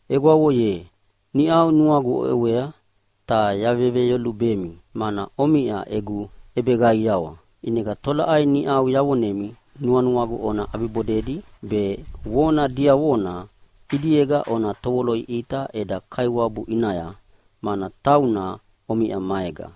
Egwavo ye, niʼau nuagu oʼewea ta yaveveyolubemi mana omiʼa egu ʼebeqaiawa. ʼInega tolaʼai niʼau yavonemi nuanuagu ona ʼabibodedi, be vona diavona ʼidiega ona tovoloʼiʼita eda Kaiwabu ʼinaya, mana tauna omiʼa maega.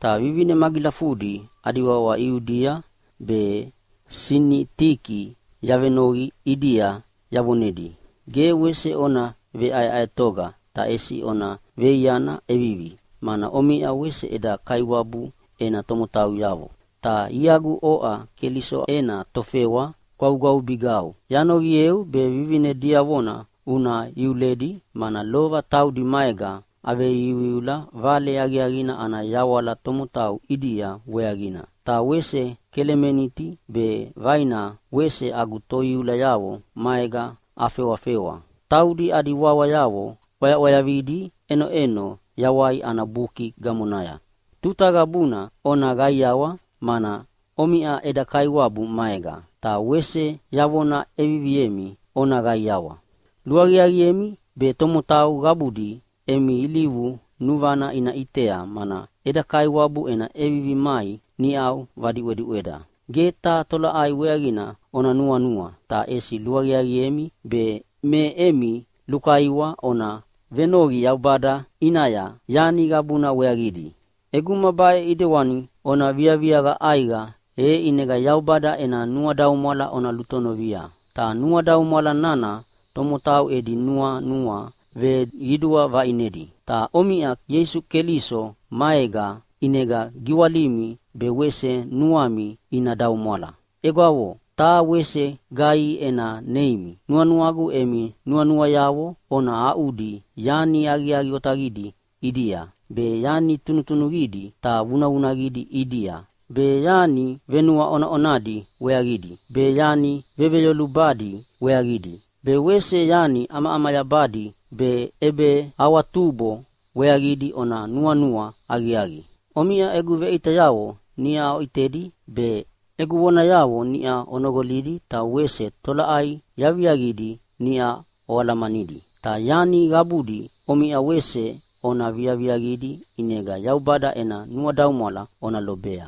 Ta vivine magilafudi adi wawa Iudia be Sinitiki yavenoqi ʼidia yavonedi, “Ge wese ona veʼaeʼaetoga ta ʼesi ona veiaiana ʼevivi, mana omiʼa wese eda Kaiwabu ena tomotauyavo.” Ta iagu oʼa Keliso ena tofewa gwavugwavubigau, yanoqieu be vivine diavona una iuledi, mana lova taudi maega aveiuiula Vale Aqiaqina ana yawala tomotau ʼidia weaqina. Ta wese Kelemeniti be vaina wese agu toiulayavo maega afewafewa. Taudi adi wawayavo ʼwayaʼwayavidi ʼenoʼeno Yawai ana Buki gamonaya. Tuta qabuna ona qaiawa, mana omiʼa eda Kaiwabu maega. Ta wese yavona ʼeviviemi, ona qaiawa! Luaqiaqiemi be tomotau qabudi emi ilivu nuvana ina ʼitea, mana eda Kaiwabu ena ʼevivi mai niʼau vadiʼwediʼweda. Ge taha tolaʼai weaqina ona nuanua, ta ʼesi luaqiaqiemi be me emi lukaiwa ona venoqi Yaubada ʼinaya yani qabuna weaqidi. ʼEguma baʼe ʼidewani ona viaviaqa ʼaiqa, e ʼinega Yaubada ena nuadaumwala ona lutonovia, ta nuadaumwala nana tomotau edi nuanua veqidua vaʼinedi. Ta omiʼa Ieisu Keliso maega, ʼinega giwalimi be wese nuami ina daumwala. Egwavo, taha wese gaihi ena neimi nuanuagu emi nuanuayavo ona aʼudi yani aqiaqi otaqidi ʼidia, be yani tunutunuqidi ta vunavunaqidi ʼidia, be yani venuaʼonaʼonadi weaqidi, be yani veveyolubadi weaqidi, be wese yani ʼamaʼamayabadi be ʼebeawatubo weaqidi ona nuanua aqiaqi. Omiʼa egu veʼitayavo niʼa oʼitedi be, egu vonayavo niʼa onoqolidi ta wese tolaʼai yaviaqidi niʼa oalamanidi, ta yani qabudi omiʼa wese ona viaviaqidi, ʼinega Yaubada ena nuadaumwala ona lobea.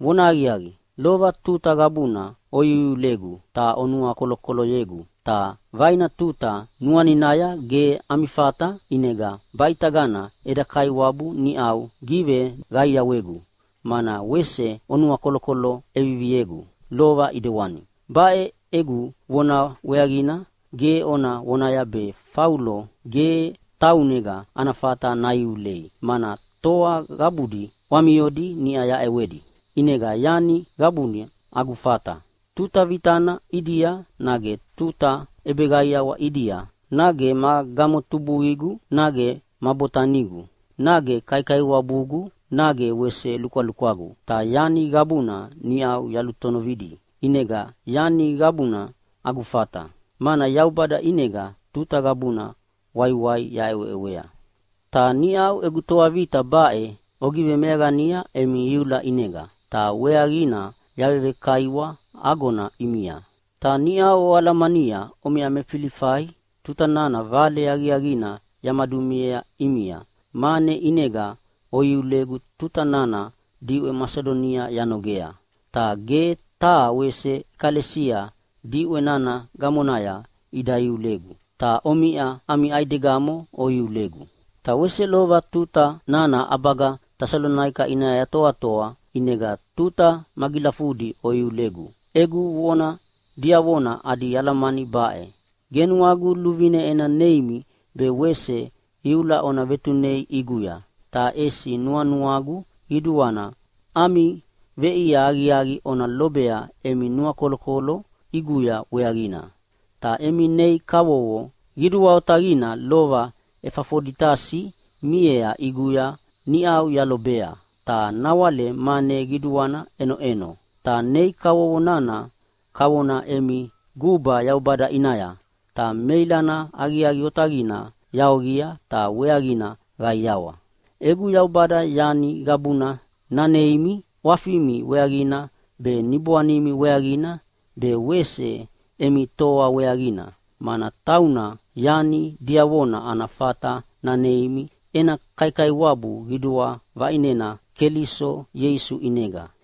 Vonahaqiaqi, lova tuta qabuna oiuiulegu ta onuakolokoloyegu, ta vaina tuta nuaninaya ge ami fata. ʼInega baʼitagana eda Kaiwabu niʼau giveqaiawegu, mana wese onuakolokolo ʼeviviegu lova ʼidewani. Baʼe egu vona weaqina ge ona vonaya be Faulo ge taunega ana fata naiulei, mana toa qabudi ʼwamiodi niʼa yaʼewedi, ʼinega yani qabuna agu fata. Tuta vitana ʼidia nage tuta ʼebeqaiawa ʼidia, nage ma gamotubuqigu, nage ma botanigu, nage kaikaiwabugu nage wese lukwalukwagu, ta yani qabuna niʼau yalutonovidi. ʼInega yani qabuna agu fata, mana Yaubada ʼinega tuta qabuna waiwai yaʼeweʼewea. Ta niʼau egu toa vita baʼe ogivemeaqania emi iula ʼinega, ta weaqina yavekaiwa agona ʼimia. Ta niʼau oalamania omiʼa me Filifai tuta nana Vale Aqiaqina yamadumiea ʼimia mane ʼinega oiulegu tuta nana diʼwe Masidonia yanogea. Ta ge taha wese ʼekalesia diʼwe nana gamonaya ida iulegu, ta omiʼa ami ʼaidegamo oiulegu. Ta wese lova tuta nana ʼabaga Tesalonaika ʼinaya yatoatoa ʼinega tuta magilafudi oiulegu. Egu vona diavona adi alamani baʼe: Ge nuagu luvine ena neimi be wese iula ona vetunei ʼiguya, ta ʼesi nuanuagu qiduana ami veʼia aqiaqi ona lobea emi nuakolokolo ʼiguya weaqina. Ta emi nei kavovo qidua otaqina lova Efafoditasi miea ʼiguya niʼau yalobea, ta nawale mane qiduana ʼenoʼeno. Ta nei kavovo nana kavona emi guba Yaubada ʼinaya, ta meilana aqiaqi otaqina yaoqia, ta weaqina qaiawa. Egu Yaubada yani qabuna naneimi ʼwafimi weaqina be, niboanimi weaqina be wese emi toa weaqina, mana tauna yani diavona ana fata naneimi ena kaikaiwabu qidua vaʼinena Keliso Ieisu ʼinega.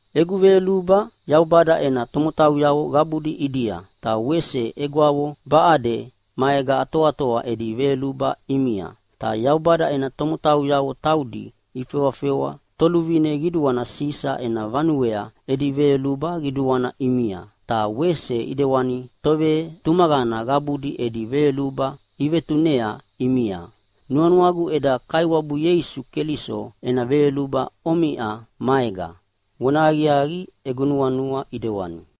Egu veyoluba Yaubada ena tomotauyavo qabudi ʼidia. Ta wese egwavo baʼade maega atoatoa edi veyoluba ʼimia. Ta Yaubada ena tomotauyavo taudi ifewafewa toluvine qiduana Sisa ena vanuea edi veyoluba qiduana ʼimia, ta wese ʼidewani tovetumaqana qabudi edi veyoluba ivetunea ʼimia. Nuanuagu eda Kaiwabu Ieisu Keliso ena veyoluba omiʼa maega. Vonahaqiaqi, egu nuanua ʼidewani.